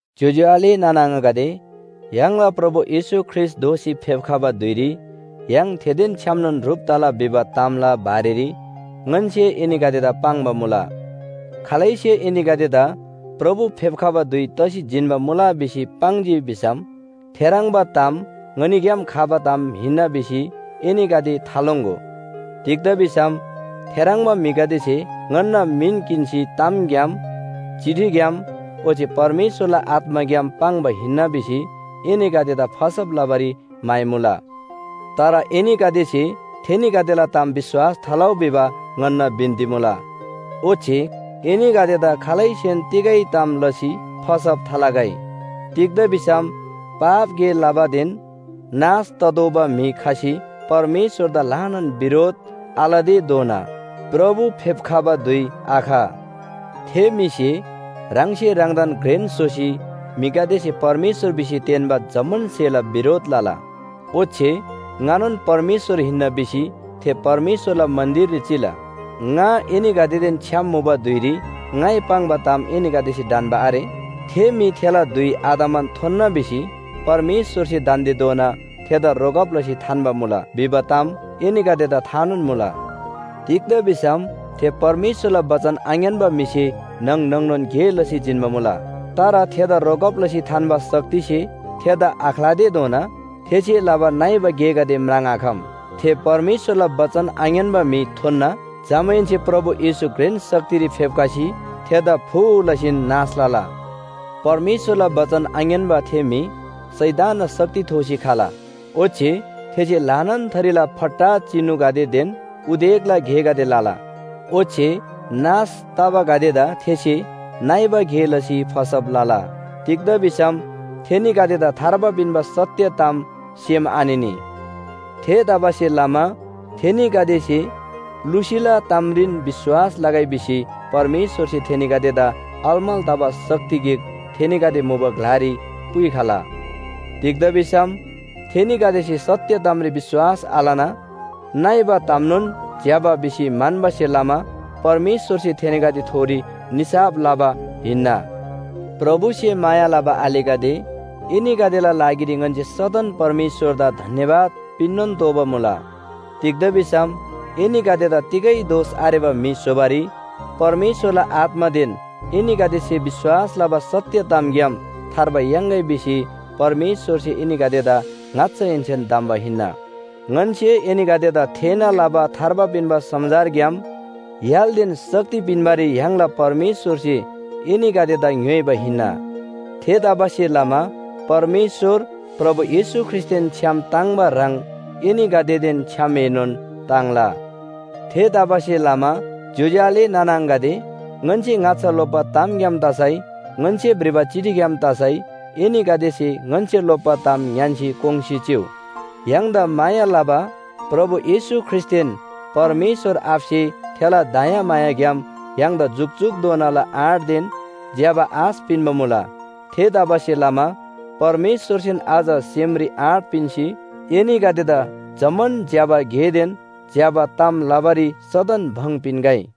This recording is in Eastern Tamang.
ज्‍योज्‍यो आले नाना आङागदे, य्‍हाङला प्रभु येशू ख्रीष्‍ट दोःसी फेप्‍खबा धुइरी य्‍हाङ थेदेन छ्‌यामनोन ह्रुप तला भिबा तामला बारेरी ङन्‍से एनीगदेदा पाङ्बा मुला। खालैसे एनीगदेदा प्रभु फेप्‍खबा धुइ तसी जिन्‍बा मुला भिसी पाङ्जी भिसम थेह्रङ्बा ताम ङनीग्‍याम खबा ताम हिन्‍ना भिसी एनीगदे थालोङ्‍गो। तिग्‍दा भिसम थेह्रङ्बा म्‍हिगदेसे ङन्‍ना मिन किन्‍सी तामग्‍याम, चिठीग्‍याम ओच्‍छे परमेश्‍वरला आत्‍माग्‍याम पाङ्बा हिन्‍ना भिसी एनीगदेदा फसब लबारी म्‍हाइमुला। तर एनीगदेसे थेनीगदेला ताम विश्‍वास थालउ भिबा ङन्‍ना बिन्‍ती मुला। ओच्‍छे एनीगदेदा खालैसेन तिगै ताम लसी फसब थालगै। तिग्‍दा भिसम पाप गे लबादेन नाश ततोःबा म्‍हि खसी परमेश्‍वरदा ल्‍हानान बिरोध आलतेधोना प्रभु फेप्‍खबा धुइ आख। थे म्‍हिसे ह्राङसे ह्राङदान घ्रेन स्‍होसी म्‍हिगदेसे परमेश्‍वर भिसी तेन्‍बा जम्‍मान स्‍हेला बिरोध लला। ओच्‍छे ङानोन परमेश्‍वर हिन्‍ना भिसी थे परमेश्‍वरला मन्‍दिररी चिला। ङा एनीगदेदेन छ्‌याम मुबा धुइरी ङाइ पाङ्बा ताम एनीगदेसे ढन्‍बा आरे? थे म्‍हि थेला धुइ आतमान थोन्‍ना भिसी परमेश्‍वरसे दान्‍देधोना थेदा रोकब लसी थान्‍बा मुला भिबा ताम एनीगदेदा थानोन मुला। तिग्‍दा भिसम थे परमेश्‍वरला बचन आङ्‌यान्‍बा म्‍हिसे न्‍हङ न्‍हङ‌नोन गे लसी जिन्‍बा मुला। तर थेदा रोकब लसी थान्‍बा शक्तिसे थेदा आख्‍लातेधोना थेसे लबा नइबा गेगदे म्राङ्आखम। थे परमेश्‍वरला बचन आङ्‌यान्‍बा म्‍हि थोन्‍ना। जमाहेन्‍से प्रभु येशू घ्रेन शक्तिरी फेप्‍खसी थेदा फू लसीन नाश लला। परमेश्‍वरला बचन आङ्‌यान्‍बा थे म्‍हि शैतानना शक्ति थोसी खला। ओच्‍छे थेसे ल्‍हानान थरीला फट्टा चिनुगदेदेन उदेकला गेगदे लला। ओच्‍छे नाश तबागदेदा थेसे नइबा गे लसी फसब लला। तिग्‍दा भिसम थेनीगदेदा थार्बा पिन्‍बा सत्‍य ताम सेम आनिनी। थेतबासेलमा थेनीगदेसे लुसीला तामरीन विश्‍वास लगै भिसी परमेश्‍वरसे थेनीगदेदा अलमल तबा शक्ति गिक थेनीगदे मुबा ग्‍लारी पुइखला। तिग्‍दा भिसम थेनीगदेसे सत्‍य तामरी विश्‍वास आलना नइबा तामनोन ज्‍यबा भिसी म्‍हन्‍बासे लमा परमेश्‍वरसे थेनीगदेथोरी निसाफ लबा हिन्‍ना। प्रभुसे माया लबा आलेगदे, एनीगदेला लागिरी ङन्‍से सदन परमेश्‍वरदा धन्‍यवाद पिन्‍नोन तोःबा मुला। तिग्‍दा भिसम एनीगदेदा तिगै दोष आरेबा म्‍हि स्‍होबारी परमेश्‍वरला आत्‍मादेन एनीगदेसे विश्‍वास लबा सत्‍य तामग्‍याम थार्बा याङ्‌गै भिसी परमेश्‍वरसे एनीगदेदा ङाच्‍छाहेन्‍सेन धम्‍बा हिन्‍ना। ङन्‍से एनीगदेदा थेःना लबा थार्बा पिन्‍बा समाचारग्‍याम य्‍हालदेन शक्ति पिन्‍बारी य्‍हाङला परमेश्‍वरसे एनीगदेदा ङ्‌योइबा हिन्‍ना। थेतबासेलमा परमेश्‍वर प्रभु येशू ख्रीष्‍टदेन छ्‌याम ताङ्‍बा ह्रङ् एनीगदेदेन छ्‌यामएनोन ताङ्ला। थेतबासेलमा ज्‍योज्‍यो आले नाना आङागदे, ङन्‍से ङाच्‍छा लोप्‍बा तामग्‍याम तसै ङन्‍से भ्रिबा चिठीग्‍याम तसै एनीगदेसे ङन्‍से लोप्‍बा ताम ङ्‌यान्‍सी कोङ्‌सी चिउ। य्‍हाङदा माया लबा प्रभु येशू ख्रीष्‍टदेन परमेश्‍वर आबासे थेला दयामायाग्‍याम य्‍हाङदा जुकजुकधोनाला आँटदेन ज्‍यबा आश पिन्‍बा मुला। थेतबासेलमा परमेश्‍वरसेन अझ सेमरी आँट पिन्‍सी एनीगदेदा जम्‍मान ज्‍यबा गेदेन ज्‍यबा ताम लबारी सदन भङ पिन्‍गै।